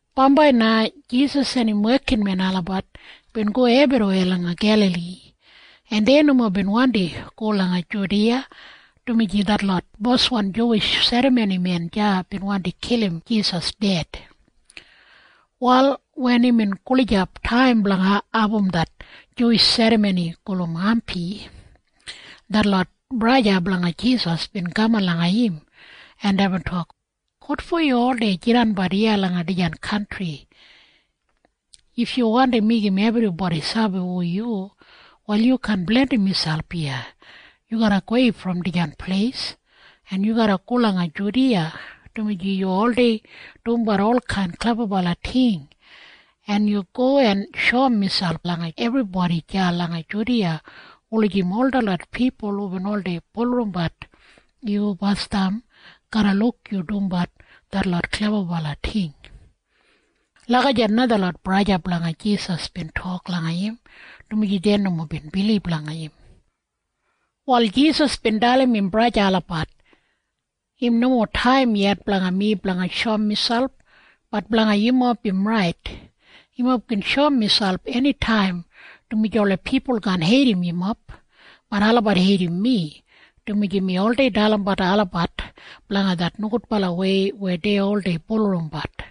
Bambai na Jisas en im wekinmen olabat bin go ebriweya langa Gelali, en dei nomo bin wandi go langa Judiya, dumaji detlot boswan Juwish serramonimen deya bin wandi kilim Jisas ded. Wal wen imbin gulijap taim blanga abum det Juwish serramoni gulum Hampi, detlot braja blanga Jisas bin kaman langa im, en deibin tok, “Wotfo yu oldei jidanbat iya langa dijan kantri? If yu wandi meigim ebribodi sabi hu yu, wal yu kaan blandim miselp iya. Yu garra gowei brom dijan pleis, en yu garra go langa Judiya, dumaji yu oldei dumbat olkain klebabala ting, en yu go en shoum miselp langa ebribodi deya langa Judiya wulijim ol detlot pipul hubin oldei bulurrumbat yu basdam garra luk yu dumbat detlot klebabala ting.” Lagijat na detlot braja blanga Jisas bin tok langa im, dumaji dei nomo bin bilib langa im. Wal Jisas bin dalim im braja olabat, “Im nomo taim yet blanga mi blanga shoum miselp. Bat blanga yumob im rait. Yumob gin shoum miselp enitaim, dumaji ola pipul kaan heidim yumob. Bat olabat heidim mi, dumaji mi oldei dalimbat olabat blanga det nogudbalawei weya dei oldei bulurrumbat.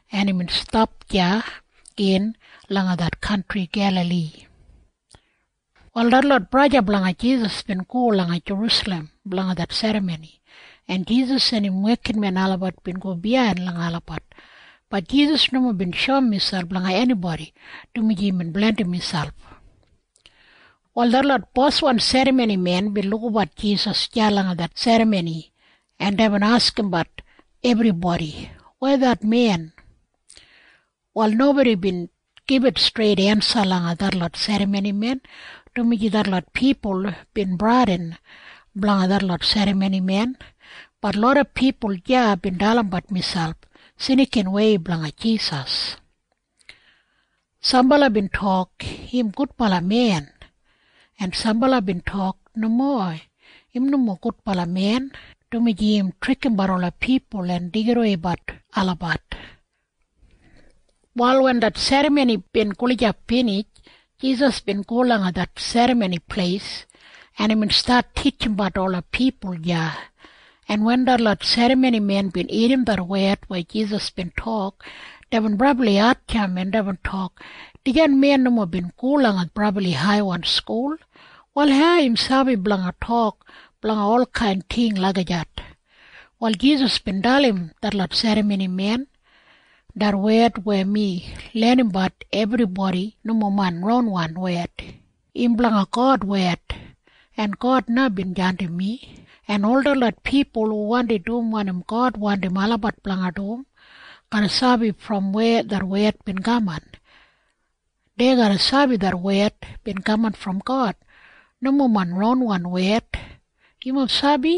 en imbin stap deya gin langa det kantri Gelali. Wal detlot braja blanga Jisas bin go langa Jerusalem blanga det serramoni, en Jisas en im wekinmen olabat bin go biyain langa olabat. Bat Jisas nomo bin shoum miselp langa enibodi, dumaji imbin blandim miselp. Wal detlot boswan serramonimen bin lukabat Jisas deya langa det serramoni, en deibin askimbat ebribodi, “Weya det men?” Wal nobodi bin gibit streit ensa langa detlot serramonimen, dumaji detlot pipul bin bradin blanga detlot serramonimen. Bat loda pipul deya bin dalimbat miselp snikinwei blanga Jisas. Sambala bin tok, “Im gudbala men.” En sambala bin tok, “Nomo. Im nomo gudbala men, dumaji im trikimbat ola pipul en deigidaweibat olabat.” Wal wen det serramoni bin gulijap binij, Jisas bin go langa det Serramoni Pleis, en imbin stat titjimbat ola pipul deya, en wen detlot serramonimen bin irrim det wed weya Jisas bin tok, deibin brabli hatjamp, en deibin tok, “Dijan men nomo bin go langa brabli haiwan skul. Wal hau im sabi blanga tok blanga olkain ting lagijat?” Wal Jisas bin dalim detlot serramonimen, “Det wed weya mi lenimbat ebribodi nomo main ronwan wed. Im blanga God wed. En God na bin jandim mi, en ol detlot pipul hu wandi dum wanim God wandim olabat blanga dum garra sabi brom weya det wed bin kaman. Dei garra sabi det wed bin kaman brom God. Nomo main ronwan wed. “Yumob sabi?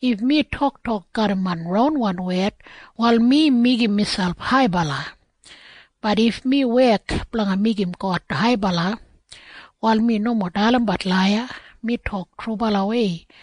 If mi toktok garram main ronwan wed, wal mi meigim miselp haibala. Bat if mi wek blanga meigim God haibala, wal mi nomo dalimbat laiya. Mi tok trubalawei.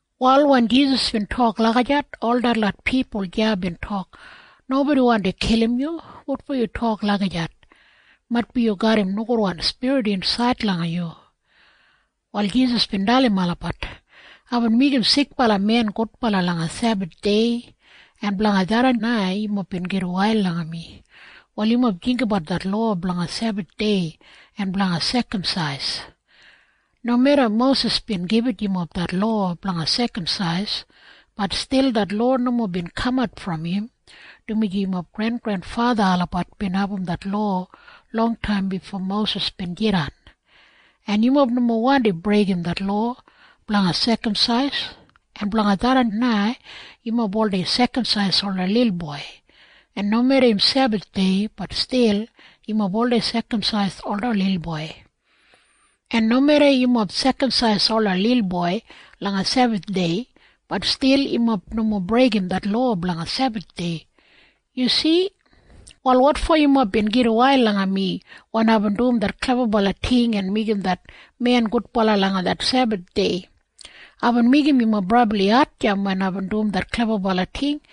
Wal wen Jisas bin tok lagijat, ol detlot pipul deya bin tok, “Nobodi wandi kilim yu! Wotfo yu tok lagijat? Maitbi yu garram nogudwan spirit insaid langa yu.” Wal Jisas bin dalim olabat, “Aibin meigim sikbala men gudbala langa Sebathdei. En blanga tharran na yumob bin gitwail langa mi. Wal yumob jinggabat det lowa blanga Sebathdei en blanga sekamsais. Nomeda Mosis bin gibit yumob det lowa blanga sekamsais, bat stil det lowa nomo bin kamat brom im, dumaji yumob grengrenfatha olabat bin abum det lowa longtaim bifo Mosis bin jidan. En yumob nomo wandi breigim det lowa blanga sekamsais. En blanga tharran na yumob oldei sekamsais ola lilboi. En nomeda im Sebathdei, bat stil yumob oldei sekamsais ola lilboi. En nomeda yumob sekamsais ola lilboi langa Sebathdei, bat stil yumob nomo breigim det lowa blanga Sebathdei. Yu si? Wal wotfo yumob bin gitwail langa mi wen aibin dum det klebabala ting en meigim det men gudbala langa det Sebathdei? Aibin meigim yumob brabli hatjamp wen aibin dum det klebabala ting.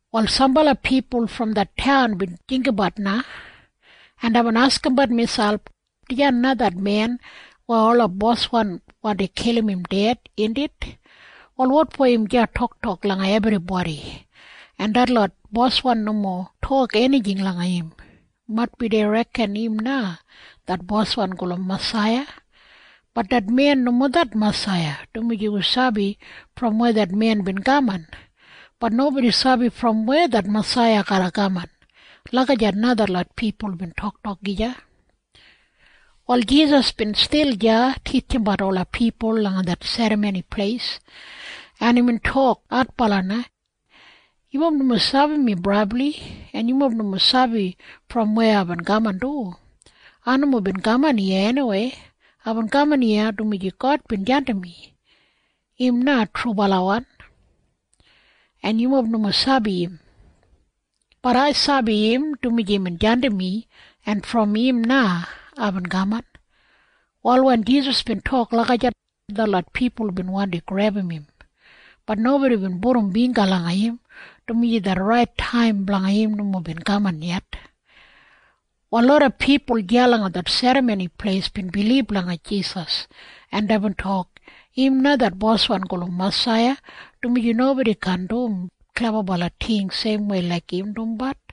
Wal sambala pipul brom det taun bin jinggabat na, en deibin askimbat miselp, “Dijan na det men weya ola boswan wandi kilim im ded, indit? Wal wotfo im deya toktok langa ebribodi, en detlot boswan nomo tok enijing langa im? Maitbi dei reken im na det Boswan gulum Masaiya. Bat det men nomo det Masaiya, dumaji wi sabi brom weya det men bin kaman. Bat nobodi sabi brom weya det Masaiya garra kaman.” Lagijat na detlot pipul bin toktok gija. Wal Jisas bin stil deya titjimbat ola pipul langa det Serramoni Pleis, en imbin tok adbala na, “Yumob nomo sabi mi brabli. En yumob nomo sabi brom weya aibin kaman du. Ai nomo bin kaman iya eniwei. Aibin kaman iya dumaji God bin jandim mi. Im na trubalawan. En yumob nomo sabi im. Bat ai sabi im, dumaji imbin jandim mi, en brom im na aibin kaman.” Wal wen Jisas bin tok lagijat, detlot pipul bin wandi grebum im. Bat nobodi bin pudum bingga langa im, dumaji det rait taim blanga im nomo bin kaman yet. Wal loda pipul deya langa det Serramoni Pleis bin bilib langa Jisas, en deibin tok, “Im na det Boswan gulum Masaiya, dumaji nobodi kaan dum klebabala ting seimwei laik im dumbat.”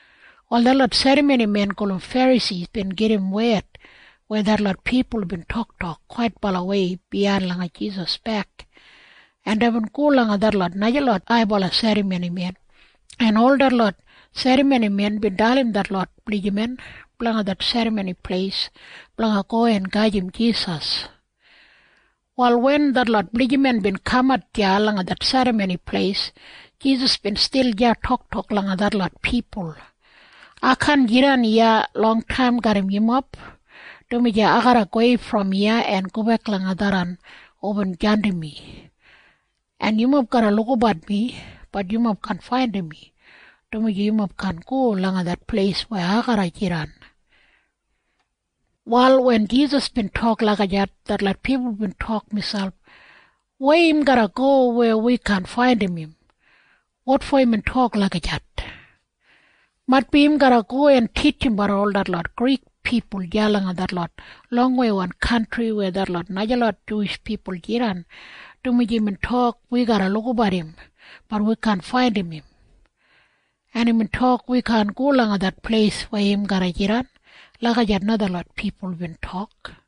Wal detlot serramonimen gulum Ferasi bin gedim wed weya detlot pipul bin toktok kwaitbalawei biyain langa Jisas bek, en deibin go langa detlot najalot haibala serramonimen, en ol detlot serramonimen bin dalim detlot blijiman blanga det Serramoni Pleis blanga go en gajim Jisas. Wal wen detlot blijiman bin kamat deya langa det Serramoni Pleis, Jisas bin stil deya toktok langa detlot pipul, “Ai kaan jidan iya longtaim garram yumob, dumaji ai garra gowei brom iya en gobek langa tharran hubin jandim mi. En yumob garra lukabat mi. Bat yumob kaan faindim mi, dumaji yumob kaan go langa det pleis weya ai garra jidan.” Wal wen Jisas bin tok lagijat, detlot pipul bin tok miselp, “Weya im garra go weya wi kaan faindim im? Wotfo imbin tok lagijat? Maitbi im garra go en titjimbat ol detlot Grik pipul deya langa detlot longweiwan kantri weya detlot najalot Juwish pipul jidan, dumaji imbin tok wi garra lukabat im. Bat wi kaan faindim im. En imbin tok wi kaan go langa det pleis weya im garra jidan.” Lagijat na detlot pipul bin tok.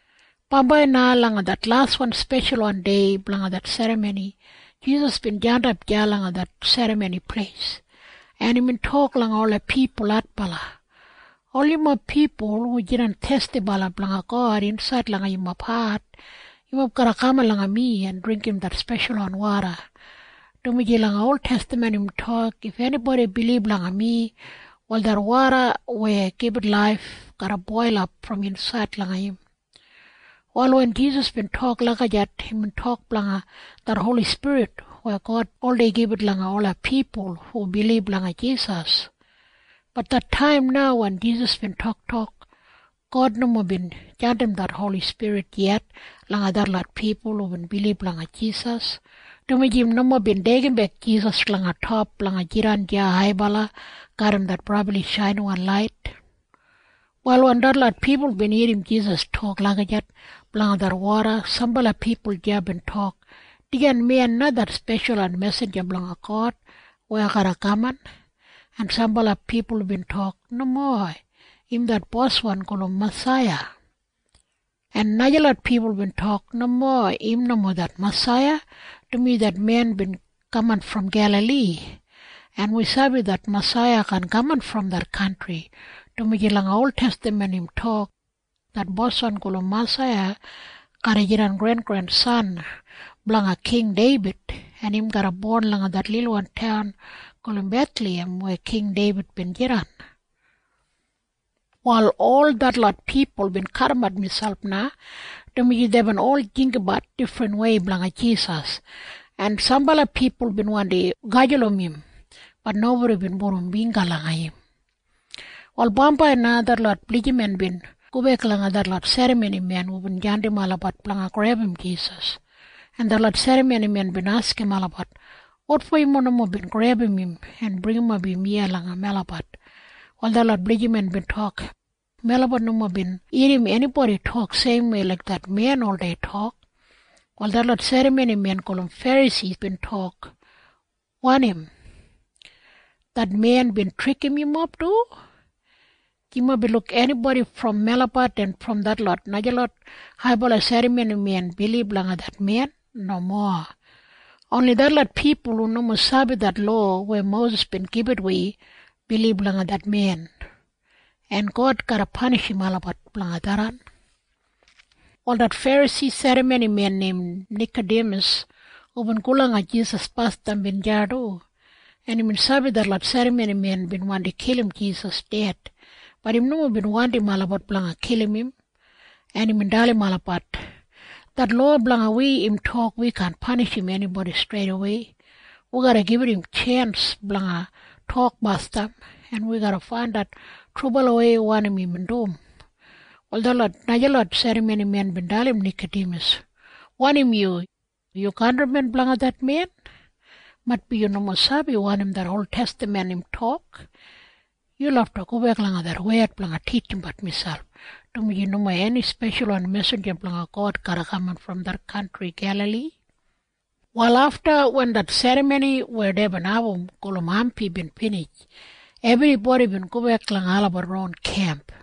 Bambai na langa det laswan speshalwan dei blanga det serramoni, Jisas bin jandap deya langa det Serramoni Pleis, en imbin tok langa ola pipul adbala, “Ol yumob pipul hu jidan thestibala blanga God insaid langa yumob hat, yumob garra kaman langa mi en dringgim det speshalwan woda, dumaji langa oltestaman im tok, ‘If enibodi bilib langa mi, wal det woda weya gibit laif garra boilap brom insaid langa im.’” Wal wen Jisas bin tok lagijat, imbin tok blanga det Holi Spirit weya God oldei gibit langa ola pipul hu bilib langa Jisas. Bat det taim na wen Jisas bin toktok, God nomo bin jandim det Holi Spirit yet langa detlot pipul hubin bilib langa Jisas, dumaji im nomo bin deigimbek Jisas langa top blanga jidan deya haibala garram det brabli shainiwan lait. Wal wen detlot pipul bin irrim Jisas tok lagijat blanga det woda, sambala pipul deya bin tok, “Dijan men na det speshalwan mesinja blanga God weya garra kaman.” En sambala pipul bin tok, “Nomo. Im det Boswan gulum Masaiya.” En najalot pipul bin tok, “Nomo. Im nomo det Masaiya, dumaji det men bin kaman brom Gelali, en wi sabi det Masaiya kaan kaman brom det kantri, dumaji langa oltestaman im tok, ‘Det Boswan gulum Masaiya garra jidan grengrensan blanga King Deibid, en im garra bon langa det lilwan taun gulum Bethlahem weya King Deibid bin jidan.’” Wal ol detlot pipul bin kadimat miselp na, dumaji deibin ol jinggabat difrinwei blanga Jisas, en sambala pipul bin wandi gajulum im. Bat nobodi bin pudum bingga langa im. Wal bambai na detlot blijiman bin gobek langa detlot serramonimen hubin jandim olabat blanga grebum Jisas, en detlot serramonimen bin askim olabat, “Wotfo yumob nomo bin grebum im en bringimap im iya langa melabat?” Wal detlot blijiman bin tok, “Melabat nomo bin irrim enibodi tok seimwei laik det men oldei tok.” Wal detlot serramonimen gulum Ferasi bin tok, “Wanim? Det men bin trikim yumob du? Yumob bin luk enibodi brom melabat en brom detlot najalot haibala serramonimen bilib langa det men? Nomo. Oni detlot pipul hu nomo sabi det lowa weya Mosis bin gibit wi, bilib langa det men. En God garra panishim olabat blanga tharran.” Wal det Ferasi serramonimen neim Nikadimas hubin go langa Jisas basdam bin deya du, en imbin sabi detlot serramonimen bin wandi kilim Jisas ded. Bat im nomo bin wandim olabat blanga kilim im, en imbin dalim olabat, “Det lowa blanga wi im tok wi kaan panishim enibodi streidawei. Wi garra gibit im tjens blanga tok basdam, en wi garra faindat trubalawei wanim imbin dum.” Wal detlot najalot serramonimen bin dalim Nikadimas, “Wanim yu? Yu kantrimen blanga det men? Maitbi yu nomo sabi wanim det oltestaman im tok. Yu lafta gobek langa det wed blanga titjimbat miselp, dumaji nomo eni speshalwan mesinja blanga God garra kaman brom det kantri Gelali.” Wal afta wen det serramoni weya deibin abum gulum Hampi bin binij, ebribodi bin gobek langa olabat ron kemp.